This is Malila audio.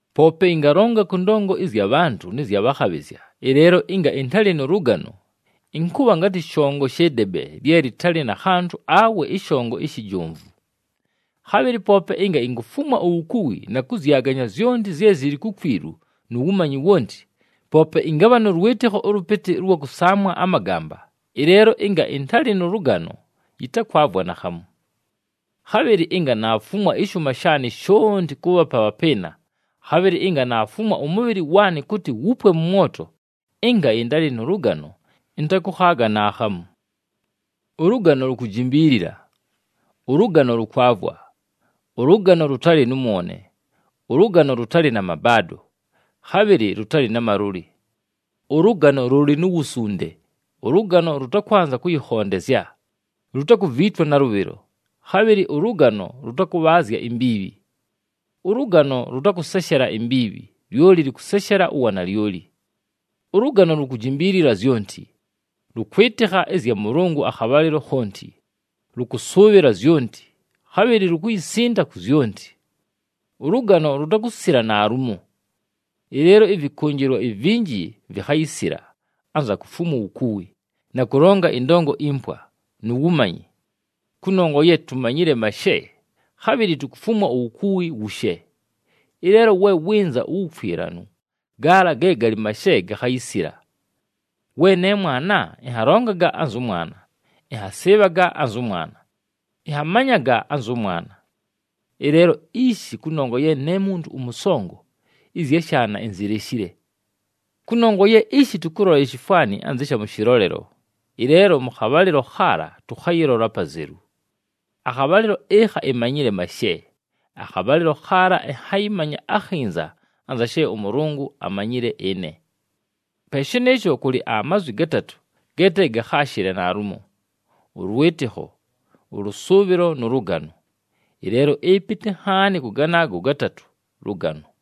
Poope ɨngalonga kʉ ndongo ɨzya bhantʉ nɨ zya bhakhabhɨzya, ɨleelo ɨnga ɨntalɨ nʉ lʉgano, ɨnkʉbha ngatɨ shongo shɨ debe lye lɨtalɨ na khantʉ awe ɨshongo ishi jomvu. Khabhɨlɨ poope ɨnga inkufumwa uwukuwi na kʉzyaganya zyonti zye zɨlɨ kukwilu nu wumanyi wonti, poope ɨngabha nʉ lwɨtɨkho ʉlʉpɨtɨ ʉlwa kʉsaamwa amagamba, ɨleelo ɨnga ɨntalɨ nʉ lʉgano, yɨtakwavwa naakhamu. Khabhɨlɨ ɨnga naafumwa ɨshʉʉma shaanɨ shonti kʉʉbhapa abhapɨɨna, khabhɨlɨ ɨnga naafumwa ʉmʉbhɨlɨ waanɨ kʉtɨ wupwe mʉ mwoto, ɨnga ɨntalɨ nʉ lʉgano, ɨntakʉkhaaga naakhamu. Ʉlʉgano lukujimbiilila, ʉlʉgano lʉkwavwa, ʉlʉgano lʉtalɨ nʉ mwone, ʉlʉgano lʉtalɨ na mabaado, khabhɨlɨ lʉtalɨ na malʉlɨ. Ʉlʉgano lʉlɨ nu wusunde, ʉlʉgano lʉtakwanza kʉyɨkhondezya, lutakuviitwa nalʉbhɨlo, khabhɨlɨ ʉlʉgano lʉtakʉbhaazya imbiibhi. Ʉlʉgano lʉtakʉseshela imbiibhi, lyoli lʉkʉseshela uwanalyoli. Ʉlʉgano lukujimbiilila zyonti, lʉkwɨtɨkha ɨzya Mʉlʉngʉ akhabhalɨlo khonti, lʉkʉsʉʉbhɨla zyonti, khabhɨlɨ lukuyisinda ku zyonti. Ʉlʉgano lutakusila naalumo. Ɨleelo ɨvɨkʉnjɨlwa ivinji vikhayisila, anza kufumwa uwukuwi, na kʉlonga ɨndongo impwa, nu wumanyi. Kʉnongwa ye tumanyile mashe, khabhɨlɨ tukufumwa uwukuwi wushe. Ɨleelo we wɨnza uwukwilanu, gaala ge galɨ mashe gakhayisila. We ne mwana, ɨnhalongaga anzʉ mwana, ɨnhasɨɨbhaga anzʉ mwana, ɨnhamanyaga anzʉ mwana. Ɨleelo ishi kʉnongwa ye ne muntu ʉmʉsongo, ɨzya shaana inzileshile. Kʉnongwa ye ishi tʉkʉlola ishifwani anzɨ sha mʉ shɨlolelo, ɨleelo mʉ khabhalɨlo khaala tʉkhayɨlola apazelu. Akhabhalɨlo ɨkha imanyile mashe, akhabhalɨlo khaala ɨnhayɨmanya akhinza anza she ʉMʉlʉngʉ amanyile ɨne. Pe shɨnɨɨsho, kʉlɨ amazwi gatatʉ ge te gakhaashɨle naalumo: ʉlwɨtɨkho, ʉlʉsʉʉbhɨlo nʉ lʉgano. Ɨleelo ɨpɨtɨ nhaani kʉ ganaago gatatʉ lʉgano.